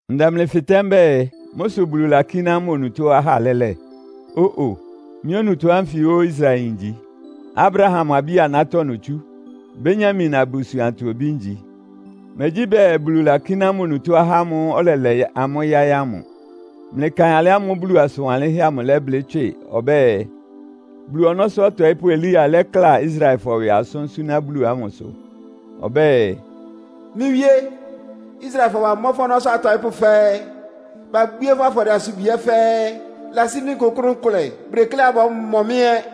Ndɛ mlɩ fɩtɛ́ mbɛ́ɛ, mʋ́ sʋ Bulu lakíná mʋ onutó ahá lɛ́lɛ? Ó-o! Mɩ́ onutó ánfɩ óó Israelyin ngyi. Abraham abí-anátɔ́ notsú. Benyamin abusuantɔ obí ngyi. Megyí bɛɛ Bulu lakíná mʋ onutó ahá amʋ́ʋ́ ɔlɛlɛ amʋ́ yáɩ́ ámʋ. Mlɩkaɩn alɩ ámʋ́ʋ́ Bulu asʋn wanlɩ́nhɛ́ amʋ lɛ́blɩ́ tswɩ ɔbɛ́ɛ, Bulu ɔnɔ́sʋ́ ɔtɔɩ́pʋ́ Elia lɛ́kla Israelfɔ ɩwɩ asʋ́n súná Bulu amʋsʋ. Ɔbɛ́ɛ, “Mɩ́ Wíé! Israelfɔ bamɔ́ fʋ́ ɔnɔ́sʋ́ atɔɩ́pʋ́ fɛ́ɛ́. Babwíé fʋ́ afɔdɩɛ-asubwi ɛ́ fɛ́ɛ́. Ɩlasí mɩ́ nkʋkʋ́nʋ́ nkʋlɛ. Bʋdekléá bɔ́mɔ mɩ́ ɛ́.”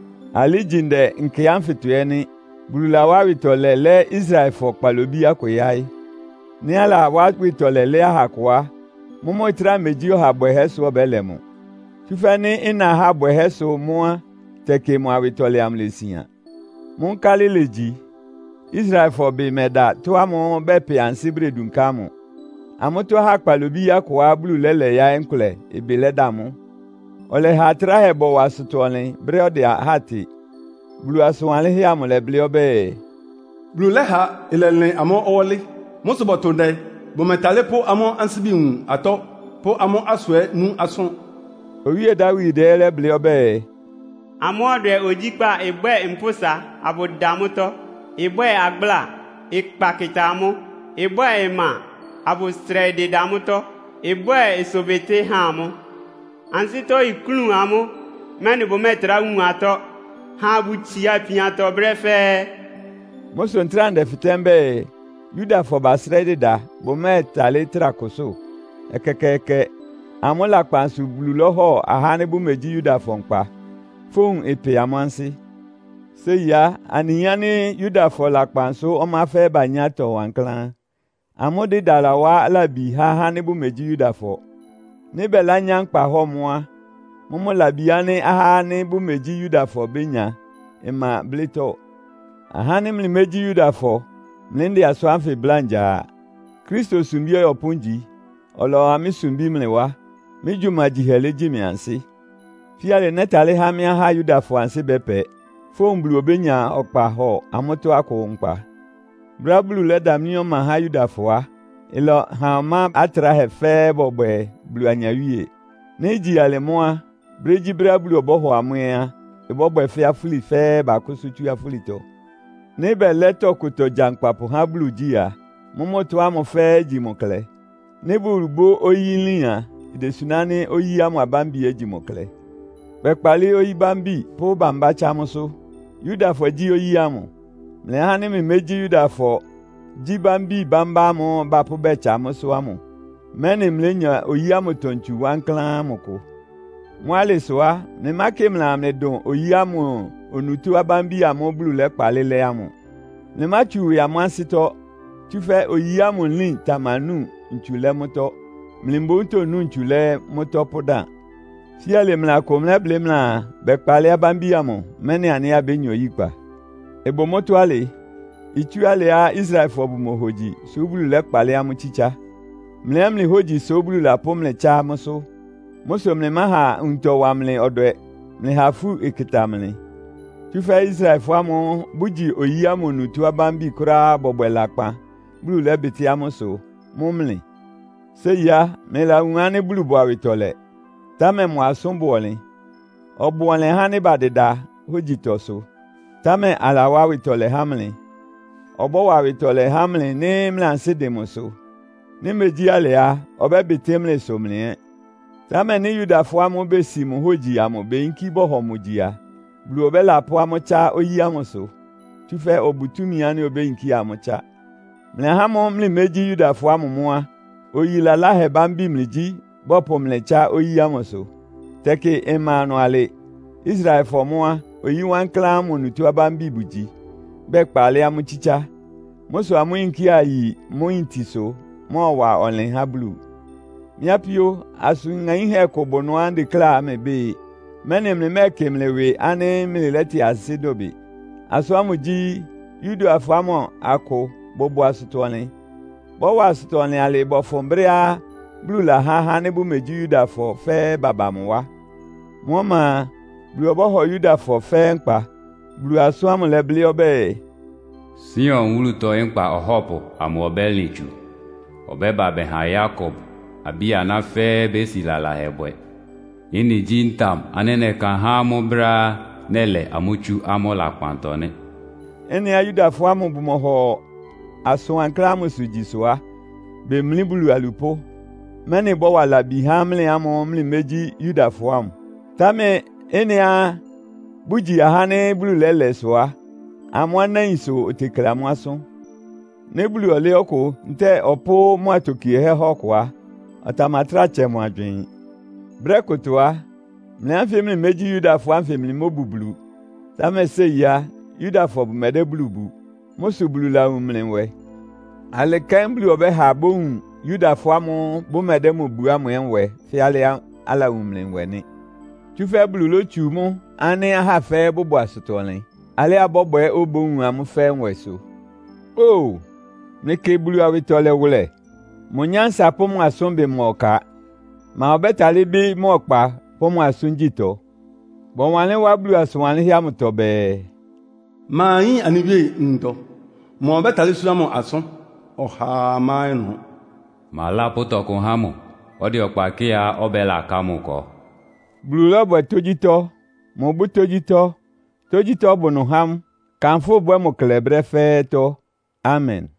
Alɩ ígyi ndɛ nkɛ ánfɩtɔ ɛ́ nɩ́. Bulu lawá awɩtɔlɛ lɛ́ Israelfɔ kpalobí akʋ yáɩ́. Nɩ́ alawá awɩtɔlɛ lɛ́ aha akʋ á, mʋ́mʋ́ ɩtráa megyí ɔha bwɛhɛ́ sʋ ɔbɛ́lɛ mʋ. Tsúfɛ́ nɩ́ ɩna ahá bwɛhɛ́sʋ́ mʋ́ á, tɛkɩ mʋ awɩtɔlɛ amʋ ilesian. Mʋ́ nkálɩ ilegyi? Israelfɔ ɩbɩ mɛda ɩtɔ́ ámʋ́ʋ́ bɛpɛ ansɩ́ bʋdedunká ámʋ. Amʋ́tɔ́ ahá kpalobí akʋá Bulu lɛ́lɛ yáɩ́ nkʋlɛ ɩbɩ lɛ́da mʋ́. Ɔlɛha atráhɛ bɔwa asʋtɔ-ɔnlɩn brɛ́á ɔdɛ ahá tɩ. Bulu asʋn wanlɩ́nhɛ́ amʋ lɛ́blɩ́ ɔbɛ́ɛ, “Bulu lɛ́ha ɩlɛlɩn amʋ́ ɔwɔ́lɩ. Mʋ́ sʋ bɔ́tʋ ndɛ bʋmɛtálɩ́ pʋ́ amʋ́ ansíbi wun atɔ́, pʋ́ amʋ́ asʋ ɛ́ nú asʋ́n.” Owíe Dawid ɛ́ lɛ́blɩ́ ɔbɛ́ɛ, “Amʋ́ ɔdwɛ ogyíkpá ɩbwɛ́ɛ mpʋ́sa abʋda mʋ́tɔ́. Ɩbwɛ́ɛ agbláa, ɩkpa kɩta amʋ́. Ɩbwɛ́ɛ ɩma, abʋsrɛɩ dɩda mʋ́tɔ́, ɩbwɛ ɩsʋbɩtɩ́ ha amʋ́. Ansɩ́tɔ́ iklún amʋ́, mɛ́nɩ bʋmɛ́ɛtrá wun atɔ́. Ha abʋtsia ipiantɔ brɛ́ fɛ́ɛ́.” Mʋ́ sʋ ntráa ndɛfɩtɛ́ mbɛ́ɛ, Yudafɔ basrɛ́ɩ́ dɩda, bʋmɛ́ɛtalɩ́ trá kʋsʋ́? Ɛkɛkɛɛkɛ! Amʋ́ lakpan sʋ Bulu lɔ́hɔ ahá ánɩ́ bʋmegyí Yudafɔ nkpa. Fówun ɩpɛ amʋ́ ansɩ́. Séi á, anɩyin ánɩ́ Yudafɔ lakpan sʋ́ ɔmá fɛ́ɛ́ banyá atɔ wankláán. Amʋ́ dɩda lawá labi há ahá ánɩ́ bʋmegyí Yudafɔ. Nɩ́ bɛlányá nkpahɔ́ɔ mʋ́ á, mʋ́mʋ́ labi ánɩ́ ahá ánɩ́ bʋmegyí Yudafɔ bénya ɩma blɩ́tɔ́. Ahá ánɩ́ mlɩmégyí Yudafɔ, mlɩ ndɛ asʋ́n ánfɩ bláa ngya a. Kristo sumbí ɔyɔpʋ́ ngyi. Ɔlɔwa mɩ́ sumbí mlɩ wá. Mɩ́ gyumagyihɛ legyi mɩ ansɩ́. Fíalɩ nɛ́talɩ́ há mɩ́ ahá Yudafɔ ansɩ́ bɛ́pɛ, fówun Bulu obénya ɔkpa hɔ amʋ́tɔ́ akʋ nkpa. Brɛ́á Bulu lɛ́damlí ɔma há Yudafɔ á, ɩlɛha ɔmá atráhɛ fɛ́ɛ́ bɔbwɛ Bulu anyawíe. Nɩ́ igyi alɩ mʋ́ á, brégyíbrɛ́á Bulu ɔbɔ́hɔ amʋ́ ɛ́ á, ɩbɔ́bwɛ fɛ́ afúli fɛ́ɛ́ bakʋ́sʋ́ tsú afúlitɔ. Nɩ́ bɛlɛ́ tɔkʋtɔ gyankpapʋ há Bulu igyí a, mʋ́mʋ́ ɩtɔ́ ámʋ fɛ́ɛ́ igyi mʋ klɛ. Nɩ́ Bulu bʋ́ oyí nlín á, idesuná ánɩ́ oyí ámʋ abámbi ɛ́ igyi mʋ klɛ. Bɛkpalɩ́ oyí bámbi pʋ́ bambá tsá mʋ́sʋ́. Yudafɔ gyí oyí ámʋ. Mlɩ ahá ánɩ́ mlɩmégyí Yudafɔ gyí bámbi bambá ámʋ́ʋ́ bapʋ́ bɛtsa mʋ́sʋ́ ámʋ, mɛ́nɩ mlénya oyí ámʋtɔ ntsu wankláán ámʋ kʋ. Mʋ́ alɩ sʋ á, mlɩmákɩ mlɩaa mlɩ dʋn oyí ámʋ onutó abámbi amʋ́ʋ́ Bulu lɛ́kpalɩ́ lɛ́ ámʋ. Mlɩmátsu ɩwɩ amʋ́ ansɩ́tɔ́, tsúfɛ́ oyí ámʋ nlín tamanu ntsu lɛ́ mlɩtɔ. Mlɩ mboún tonu ntsu lɛ́ mʋ́tɔ́ pʋ́dan. Fíalɩ mlɩ akʋ mlɛ́blɩ́ mlɩaa, “Bɛkpalɩ́ abámbi amʋ, mɛ́nɩ anɩ ɛ́ abénya oyíkpa.” Ɩbʋ mʋ́tɔ́ alɩ. Itsú alɩá Israelfɔ bʋmohogyi sʋ́ Bulu lɛ́kpalɩ́ amʋ́ tsítsá. Mlɩ ɛ́ mlɩ hógyi sʋ́ Bulu lapʋ́ mlɩ tsá mʋ́sʋ́. Mʋ́ sʋ mlɩmáha nwuntɔ ɩwa mlɩ ɔdwɛ. Mlɩha ifú ɩkɩta mlɩ. Tsúfɛ́ Israelfɔ ámʋ́ʋ́ bʋgyi oyí ámʋ onutó abámbi kʋ́ráá bɔbwɛ lakpan, Bulu lɛ́bɩtɩ́ amʋ́ ɩsʋ, mʋ́ mlɩ? Séi á, mlɩlawun ánɩ́ Bulu bʋ awɩtɔlɛ, támɛ mʋ asʋ́n bʋ ɔnlɩn. Ɔbʋ ɔnlɩn ahá ánɩ́ badɩda hógyitɔsʋ. Támɛ alawá awɩtɔlɛ há mlɩ. Ɔbɔ́wa awɩtɔlɛ há mlɩ nɩ́ mlɩ ansɩ́ dɩn mʋsʋ. Nɩ́ megyí alɩ á, ɔbɛ́bɩtɩ́ mlɩ ɩsʋ mlɩ ɛ́. Támɛ nɩ́ Yudafɔ ámʋ́ʋ́ besi mʋ hógyi amʋ beyinkí bɔhɔ mʋ gyi a, Bulu ɔbɛ́lapʋ́ amʋ́ tsá oyí ámʋsʋ. Tsúfɛ́ ɔbʋ túmi ánɩ́ obéyinkía amʋ́ tsá. Mlɩ ahá ámʋ́ʋ́ mlɩmégyí Yudafɔ ámʋ mʋ́ á, oyí laláhɛ bámbi mlɩgyí, bɔpʋ mlɩ tsá oyí ámʋsʋ. Tɛkɩ ɩma ɩnʋ alɩ. Israelfɔ mʋ́ á, oyi wankláán ámʋ onutó abámbi bʋgyi, bɛkpalɩ́ amʋ́ tsítsá. Mʋ́ sʋ amʋ́ yinkía yi mʋ́ yintisʋ mɔ́ɔwa ɔnlɩn há Bulu. Mɩ́ apíó, asʋn ŋaínhɛ́ kʋ bʋ ɩnʋá ndekléá mlɩbɩ́ɩ, mɛ́nɩ mlɩmɛ́ɛkɩ mlɩ ɩwɩ ánɩ́ mlɩlɛ́tɩn ansɩ́ dʋbɩ. Asʋ́n ámʋ gyí, Yudafɔ ámʋ akʋ bʋbʋ asʋtɔ-ɔnlɩn. Bɔ́wa asʋtɔ-ɔnlɩn alɩɩ bɔfʋn brɛ́á Bulu lahá ahá ánɩ́ bʋmegyí Yudafɔ fɛ́ɛ́ baba mʋ wá. Mʋ́ ɔma a, Bulu ɔbɔ́hɔ Yudafɔ fɛ́ɛ́ nkpa. Bulu asʋ́n ámʋ lɛ́blɩ́ ɔbɛ́ɛ, “Sion wúlutɔ Nkpa Ɔhɔ́pʋ amʋ ɔbɛ́lɩn tsu. Ɔbɛ́ba bɛha Yakob abí-aná fɛ́ɛ́ bési lalahɛ bwɛ. Ɩ́nɩ gyí ntam ánɩ́ nɛ́ka há amʋ́ brɛ́á nɛ́lɛ amʋ́ tsú amʋ́ lakpantɔ nɩ́.” Ɩ́nɩá Yudafɔ ámʋ bʋmɔhɔ asʋn wankláán ámʋsʋ gyi sʋ á, bemlí Bulu alupʋ́, mɛ́nɩ ɩbɔ́wa labi há mlɩ ámʋ́ʋ́ mlɩmégyí Yudafɔ ámʋ. Támɛ ɩ́nɩá bʋgyi ahá ánɩ́ Bulu lɛ́lɛ sʋ a, amʋ́ anáin sʋ otekle amʋ́ asʋ́n. Nɩ́ Bulu ɔlɛ́ ɔkʋ ntɛ́ɛ ɔpʋ́ mʋ atokiehɛ́ há ɔkʋ á, ɔtamatráa tsɛ mʋ agywɩɩn. Brɛ́ kʋtɔ á, mlɩ ánfɩ mlɩmégyí Yudafɔ ánfɩ mlɩmóbu Bulu. Támɛ séi á, Yudafɔ bʋmɛdɛ́ Bulu bu. Mʋ́ sʋ Bulu lawun mlɩ nwɛ. Alɩ kɛ́n Bulu ɔbɛ́ba bowun Yudafɔ ámʋ́ʋ́ bʋmɛdɛ́ mʋ bu ámʋ ɛ́ nwɛ fɛ́ alɩá alawun mlɩ nwɛ nɩ́. Tsúfɛ́ Bulu lótsu mʋ́ ánɩ́ ahá fɛ́ɛ́ bʋbʋ asʋtɔ-ɔnlɩn, alɩá ɩbɔ́bwɛ obówun amʋ́ fɛ́ɛ́ nwɛ sʋ. Óo, mlɩkɩ Bulu awɩtɔlɛ wʋlɛ! Mʋ nyánsa pʋ́ mʋ asʋ́nbɩ ma ɔka! Ma ɔbɛ́talɩ́ bɩ́ mʋ ɔkpa pʋ́ mʋ asʋ́ngyítɔ? Bɔwanlɩ́n wá Bulu asʋn wanlɩ́nhɛ́ amʋtɔ bɛɛ, “Ma yín anɩ Wíe nwuntɔ? Ma ɔbɛ́talɩ́ súná mʋ asʋ́n? Ɔhaa má ɩnʋ. Ma lápʋ́ tɔkʋ há mʋ, ɔdɛ ɔkpa kɩ́ɩá ɔbɛ́laka mʋ ɩkɔ?” Bulu lɔ́bwɛ tógyítɔ́. Mʋbʋ́ tógyítɔ́. Tógyítɔ́ bʋ ɩnʋ há mʋ. Kanfʋ́ ɩbwɛ́ɛ mʋ klɛ brɛ́ fɛ́ɛ́tɔ́. Amen!